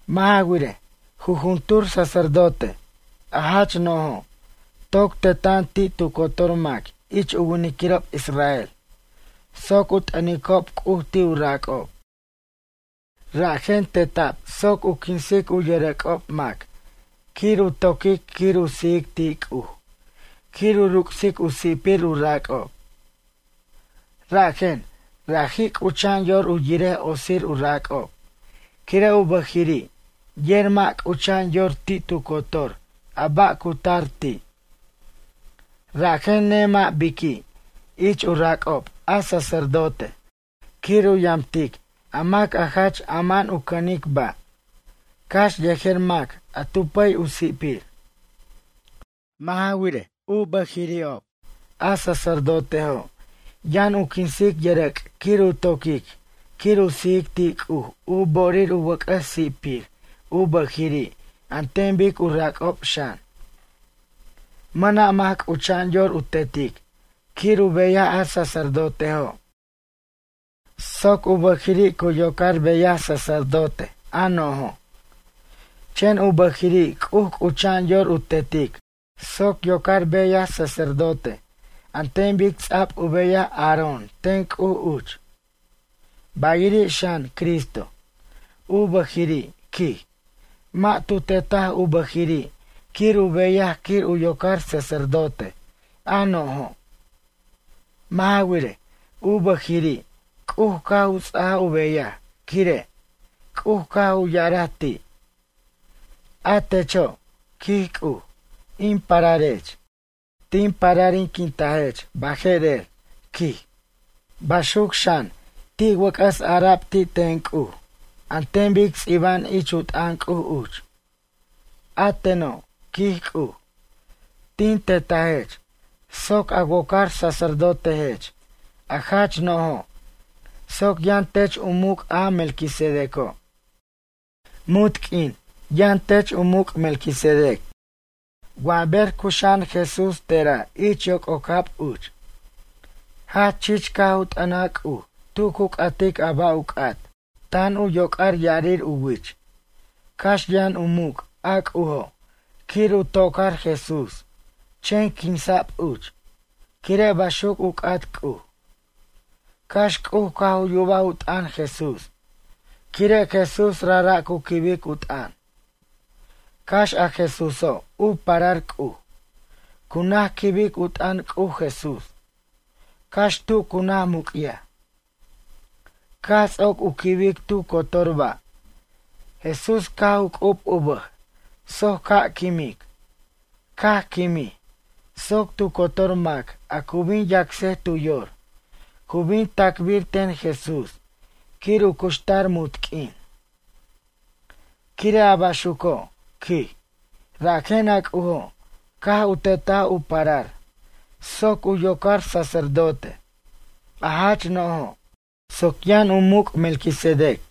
Mʌ' ja wirej, jujuntur sacerdote, a jach no'jo', toc teta'an ti' tu cotor mac ich u winiquirob israel soc u t'ʌnicob C'uj ti' u rac'ob. Rajen teta'b soc quinsic u yʌrʌc'ob mac quir u toquic quir u sijic ti' C'uj quir u ruc'sic u si'pir u rac'ob. Rajen, raji' c'ucha'an yor u yirej otsir u rac'ob quire' u bʌjiri' yer mʌ' c'ucha'an yor ti' tu cotor a ba' a cu tar ti'. Rajen nemʌ' biqui' ich u rac'ob a sacerdote quir u yamtic a mac a jach ama'an u cʌnic ba', cax yejer mac a tu pʌy u si'pir. Mʌ' ja wirej, u bʌjirirob a sacerdotejo' yʌn u quinsic yʌrʌc' quir u toquic quir u sijic ti' C'uj u bo'orir u wʌc'ʌs si'pir u bʌjiri' an ten bic u rac'ob xan. Mʌna' mac c'ucha'an yor u tetic quir u beyaj a sacerdotejo' soc u bʌjiri' cu yocar beyaj sacerdote a no'jo'. Chen u bʌjiri' C'uj c'ucha'an yor u tetic soc yocar beyaj sacerdote an ten bic ts'a'b u beyaj Aarón ten C'uj uch. Bayiri' xan, Cristo. U bʌjiri', quij, mʌ' tu tetaj u bʌjiri' quir u beyaj quir u yocar sacerdote, a no'jo'. Mʌ' ja wirej, u bʌjiri' C'uj caj u ts'ajaj u beyaj quire'. C'uj caj u ya'araj ti': A techo', quij C'uj, in pararech. Tin pararinquintajech baje'rer, quij. Baxuc xan ti' wʌc'ʌs ara'b ti' ten C'uj an ten bic ts'iba'an ich u t'ʌn C'uj uch: A teno', quij C'uj, tin tetajech soc a wocar sacerdotejech a jach no'jo' soc yʌn tech u muc' a Melquisedeco'. Munt q'uin yʌn tech u muc' Melquisedec. Wa ber cuxa'an Jesús te'ra' ich yoc'ocab uch. Jach chich caj u t'ʌnaj C'uj tu cu c'atic a ba' u c'at, tan u yoc'ar ya'arir u wich. Cax yʌn u muc' a C'ujo' quir u to'car Jesús chen quinsa'b uch, quire' baxuc u c'at C'uj. Cax C'uj caj u yubaj u t'ʌn Jesús quire' Jesús rajra' cu quibic u t'ʌn. Cax a Jesúso' u parar C'uj, cu naj quibic u t'ʌn C'uj Jesús, cax tu cu naj muc'yaj. Caj ts'oc u quibic tu cotor ba', Jesús caj u c'ub u bʌj soc ca' quimic. Caj quimij soc tu cotor mac a cu bin yacsej tu yor, cu bin tacbir ten Jesús quir u cuxtar munt q'uin. Quire' a baxuco', quij, rajen a C'ujo' caj u tetaj u parar soc u yocar sacerdote, a jach no'jo' soc yʌn u muc' Melquisedec.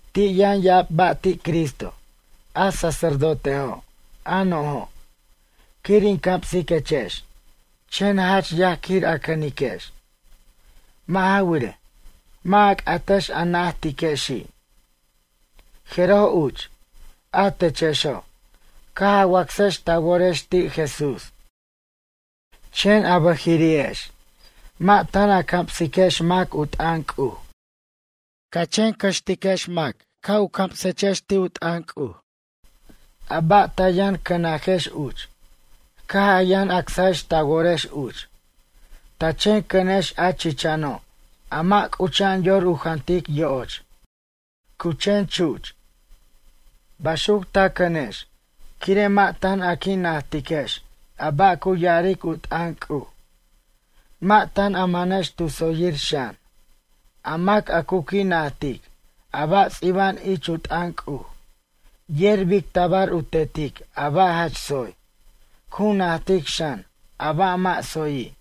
Ti' yʌn ya'ab ba' ti' Cristo, a sacerdotejo' a no'jo', quir in camsiquechex chen jach yaj quir a cʌniquex. Mʌ' ja wirej, mʌ' a c'atex a najtexi'. Jeroj uch, a techexo', caj a wacsex ta worex ti' Jesús. Chen a bʌjiri'ex, mʌ' tan a camsiquex mac u t'ʌn C'uj. Ca chen cʌxtex mac ca' u camsequechex ti' u t'ʌn C'uj, a ba' ta yʌn cʌnajex uch caj a yʌn acsajex ta worex uch. Ta chen cʌnex a chichano', a mʌ' c'ucha'an yor u jantic yo'och, cu chen chuch. Baxuc ta cʌnex, quire' mʌ' tan a qui' najtiquex a ba' cu ya'aric u t'ʌn C'uj, mʌ' tan a manex tu tsoyir xan. A mac a cu qui' najtic a ba' ts'iba'an ich u t'ʌn C'uj yer bic tabar u tetic a ba' jach tsoy. Cu najtic xan a ba' mʌ' tsoyi'.